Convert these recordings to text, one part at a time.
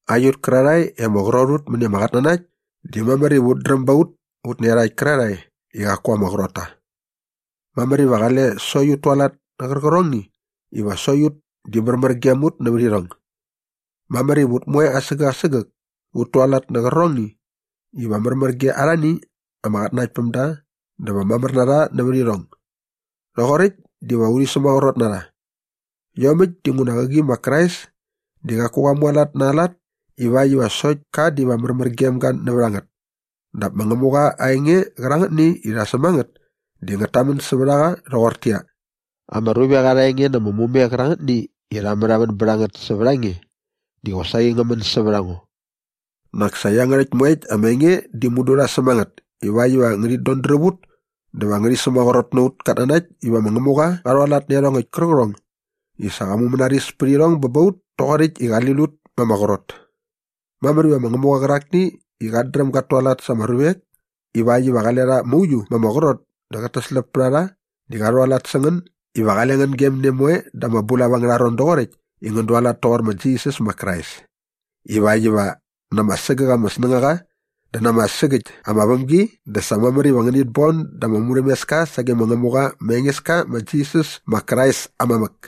Aiut kärarhae i ama qrot ut mäni ama qatnanakt di mamär iva ut dräm ba ut ut nä iarhakt kärarhae i qaku ama qrot ta. Mamär iva qale sokt ut tualat nä qärqärhongni iva sokt ut di märmär gem ut nävät irhong. Mamär iva ut moe asägäk asägäk ut tualat nä qärqärhongni iva märmär ge arhani ama qatnanaktpämda dä va mamär na rha nävät irhong. Rhoqoräkt diva urhi sämaqrot na rha. Iomäkt dinguna qäqi ma Krais di qaku qa mualat na aa lat ivakt iva sokt ka diva märmär gem ga nävät a ngät. Dap ma Ngämuqa aa enge qärangätni i rha säm a ngät di ngät tamän sävät a qa rhoqortäqyia, “Ama ruvek arha enge na ama mume qärangätni i rha märhamän bät a ngät sävät a nge di qosaqi ngä män sävät a ngo.” Nak sa iangärhäkt moekt ama enge di mudu rha säm a ngät iväkt iva ngärhit todräp ut dä va ngärhi sämaqrot na aut katnanakt iva ma Ngämuqa qa rhualat nä iarhongäkt kärqärhong i sa qa mumänaris pät irhong bä ba ut toqoräkt i qali lut ma ama qrot. Mamär iva ma Ngämuqa qärakni i qat dräm gat tualat sa ama ruvek ivakt iva qale rha mauiu ma ama qrot dä qät täsläp pät a rha di qa rhualat sä ngän iva qale ngän gem ne moe da ama bulap angärha ron doqoräkt i ngän dualat toqor ma Jisas ma Krais ivakt iva na ama sägäk ama snängaqa dä na ama sägäkt ama vämgi dä sa mamär iva ngänit bon da ama murhämeska sage ma Ngämuqa ma Engeska ma Jisas ma Krais aa mamäk.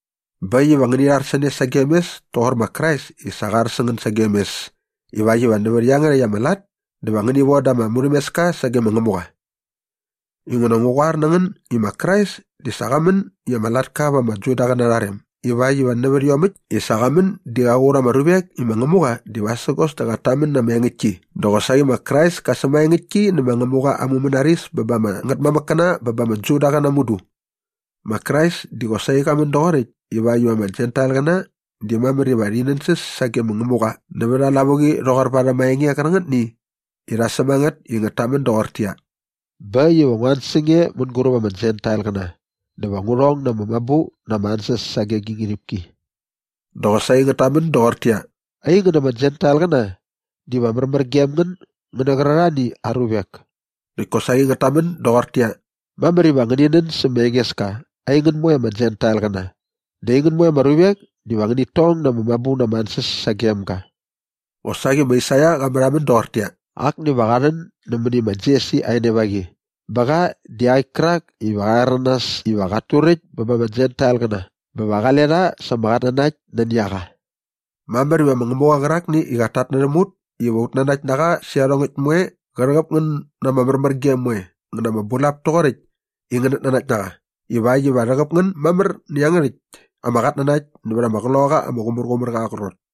Bä äkt iva ngäni rhar sä ne sagem mes toqor ma Krais i sa qa ar sä ngän sagem mes ivakt iva nävät iangärhäkt ama lat dä va ngäni von da ama murhämeska sage ma Ngämuqa. Inguna ngu qoar na ngän i ma Krais di sa qa män i ama latka va ama Judaqäna arha rem ivakt iva nävät iomäkt i sa qa män di qa qur ama ruvek i ma Ngämuqa di vasägos dä qat tamän na ama engäktki dä qosaqi ma Krais kä sämaengäktki nä ma Ngämuqa aa mumänaris bä ba ama ngätmamäkkäna bä ba ama Judaqäna mudu. Ma Krais di qosaqi qa män doqoräkt ivakt iva ama Jentailqäna di mamär iva rhi nänsäs sage mä Ngämuqa nävät aa lavuqi rhoqor varhäm aa enge qärangätni i rha säm a ngät i ngät tamän doqortäqyia, “Bä äkt iva ngua an sä nge mänguräp ama Jentailqäna dä va ngu rhong na ama mabu na ama ansäs sage gi ngärhipki.” Dä qosaqi ngät tamän doqortäqyia, “Aingän ama Jentailqäna, diva märmär gem ngän ngän nä qärarhani aa ruvek.” Näkt kosaqi ngät tamän doqortäqyia, “Mamär iva ngäni nän sä ma Engeska aingän moe ama Jentailqäna dä aingän moe ama ruvek diva ngänit tong na ama mabu na ama ansäs sagem ga.” Qosaqi ma Aisaia qa märhamän doqortäqyia, “Akni va qa rhän nämäni ma Jesi aa enevaqi bä qa di iaqäkt kärak iva qa rhäranas iva qat turäkt bä ba ama Jentailqäna bä va qale rha sa ama qatnanakt nani a qa.” Mamär iva ma Ngämuqa qärakni i qat tatnärhäm ut iva ut nanakt na qa sä iarhongäkt moe qä rhäqäp ngän na ama märmärgem moe ngä na ama bulap toqoräkt i ngänät nanakt na qa ivakt iva rhäqäp ngän mamär nä iangärhäkt ama qatnanakt nävät ama Qloqaqa ama Qumärqumärqa aa qrot.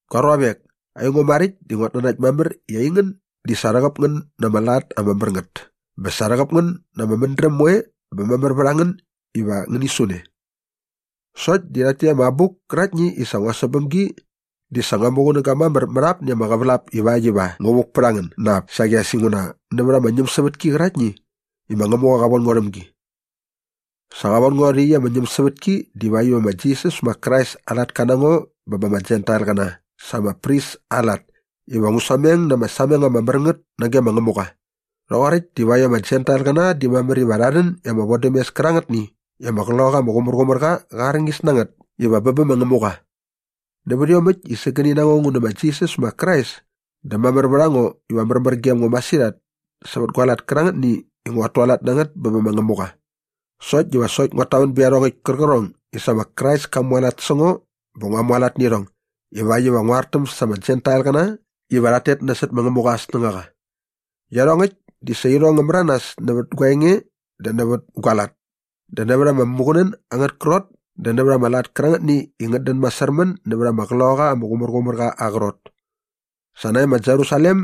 Gua ruavek, aingo maräkt di nguat nanakt mamär i aingän di sa rhäqäp ngän na ama lat ama mär ngät bä sa rhäqäp ngän na ama mädräm moe bä mamär vät a ngän iva ngäni su ne. Sokt di rhakt täkt ama abuk käraktni i sa ngua säm bäm gi di sa ngua muqunäga mamär mät apni ama qävälap ivakt iva ngu vuk pät a ngän na ap saqi as inguna nävät ama ñämsävätki qäraktni i ma Ngämuqa qa von ngo rhäm gi. Sa qa von ngo rhä iaqyäkt ama ñämsävätki divakt iva ma Jisas ma Krais aa latka na ngo bä ba ama Jentailqäna sa ama pris aa lat iva ngu sameng na ama sameng ama mär ngät nage ma Ngämuqa. Rhoqoräkt divakt iva ama Jentailqäna di mamär iva rha rhän i ama vodämes kärangätni i ama Qloqaqa ama Qumärqumärqa qa arñis na ngät iva bä bä ma Ngämuqa. Nävät iomäkt i sägäni na ngo ngu nä ma Jisas ma Krais dä mamär vät a ngo iva märmär gem ngo masirhat sävät gua lat kärangätni i nguat tualat na ngät bä bä ma Ngämuqa. Sokt diva sokt nguat tamän bät iarhongäkt kärqärhong i sa ma Krais ka mualat sä ngo bä ngua mualat nä irhong ivakt iva ngu artäm sa ama Jentailqäna iva rhat tet nasot ma Ngämuqa aa snängaqa. Iarhongäkt di sa irhong ngä märanas nävät gua enge dä nävät gua lat dä nävät ama muqunän angät krot dä nävät ama lat kärangätni i ngät dän masärmän nävät ama Qloqaqa ama Qumärqumärqa aa qrot. Sa nae ma Jerusalem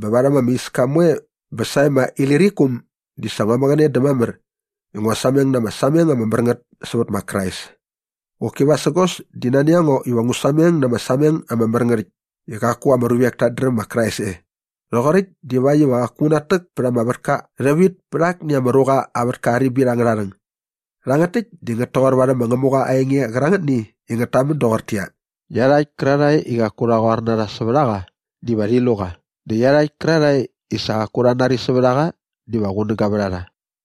bä varhäm ama iska moe bä sae ma Ilirikum di sa ngua mäqäne dä mamär i ngua sameng na ama sameng ama mär ngät sävät ma Krais. Qoki vasägos di nani a ngo iva ngu sameng na ama sameng ama mär ngät äkt i qaku ama ruvek tat dräm ma Krais e. Rhoqoräkt divakt iva qaku ngu natäk pät ama vätka rhävit pät akni ama ruqa aa vätka aa ribit angärha rhäng. Rhangät täkt di ngät toqor varhäm ma Ngämuqa aa enge qärangätni i ngät tamän doqortäqyia, “Iarhakt kärarhae i qaku rha qoar na rha sävät a qa diva rhi lu qa dä iarhakt kärarhae i sa qaku rha nari sävät a qa diva qunäga vät a rha.”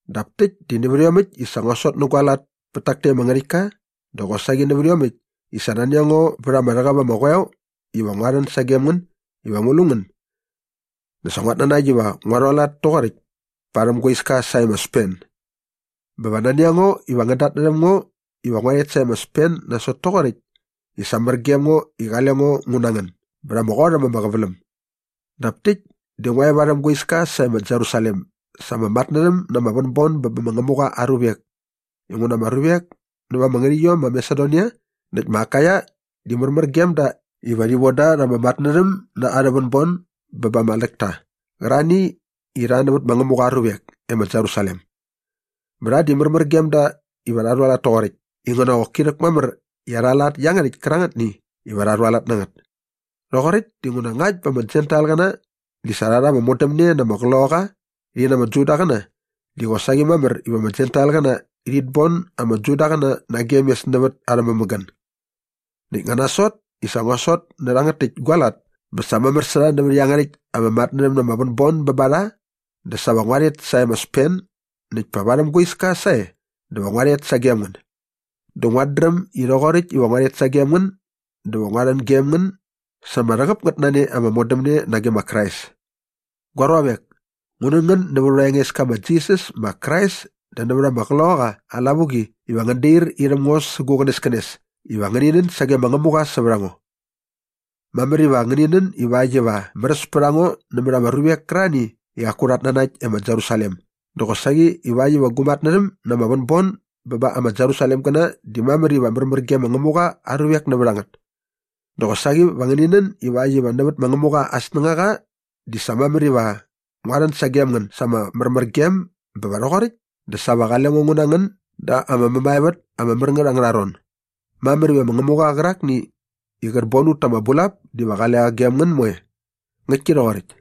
Dap täkt di nävät iomäkt i sa ngua sot nä gua lat pät tak täkt ama ngärhäktka dä qosaqi nävät iomäkt i sa nani a ngo vät ama rhäqäp ama qoeo iva ngua rhän sagem ngän iva ngu lu ngän dä sa nguat nanakt iva ngua rhualat toqoräkt parhäm gua iska sae ma Spen. Bä va nani a ngo iva ngän datnärhäm ngo iva ngua rhet sae ma Spen nasot toqoräkt i sa mär gem ngo i qale ngo ngu na ngän bät ama qot äm ama qäväläm. Dap täkt di ngua e varhäm gua iska sae ma Jerusalem sa ama matnärhäm na ama vänbon bä bä ma Ngämuqa aa ruvek inguna ama ruvek näva ama ngärhäqyiom ma Masedonia näkt ma Akaia di märmär gem da iva rhi von da rha ama matnärhäm na arhä vänbon bä ba ama tläkta qärarhani i rha nävät ma Ngämuqa aa ruvek e ma Jerusalem. Bä rha di märmär gem da iva rha rhualat toqoräkt inguna qoki rhäkmamär i arha lat iangärhäkt kärangätni iva rha rhualat na ngät. Rhoqoräkt dinguna ngakt bä ama Jentailqäna di sa rha rha ama modämne na ama qloqaqa rhi na ama Judaqäna di qosaqi mamär iva ama Jentailqäna rhit bon ama Judaqäna nagem mes nävät arhä mämägän. Näkt nga nasot i sa ngua sot nä rhangät täkt gua lat bä sa mamär sä rha nävät iangärhäkt ama matnärhäm na ama vänbon bä ba rha dä sa va ngua rhet sae ma Spen näkt pa varhäm gua iska sae dä va ngua rhet sagem ngän. Dä nguat dräm i rhoqoräkt iva ngua rhet sagem ngän dä va ngua rhän gem ngän sa ama rhäqäp ngät na ne ama modämne nage ma Krais. Gua ruavek, ngu nän ngän nävät aurha Engeska ma Jisas ma Krais dä nävät ama Qloqaqa aa lavuqi iva ngän dair irhäm ngo sä gu qänäskänes iva ngäni nän sage ma Ngämuqa sävät a ngo. Mamär iva ngäni nän ivakt iva märäs pät a ngo nämät ama ruvek kärarhani i qaku rhat nanakt e ma Jerusalem dä qosaqi ivakt iva gu matnärhäm na ama vänbon bä bä ma Jerusalemgäna di mamär iva märmär ge ma Ngämuqa aa ruvek nävät a ngät. Dä qosaqi va ngäni nän ivakt iva nävät ma Ngämuqa aa snängaqa di sa mamär iva ngua rhän sagem ngän sa ama märmärgem bä va rhoqoräkt dä sa va qale ngo ngu na ngän da ama mämaevät ama mär ngät angärha ron. Mamär iva ma Ngämuqa qärakni i qät bon ut ta ama bulap diva qale qa gem ngän moe. Ngäktki rhoqoräkt.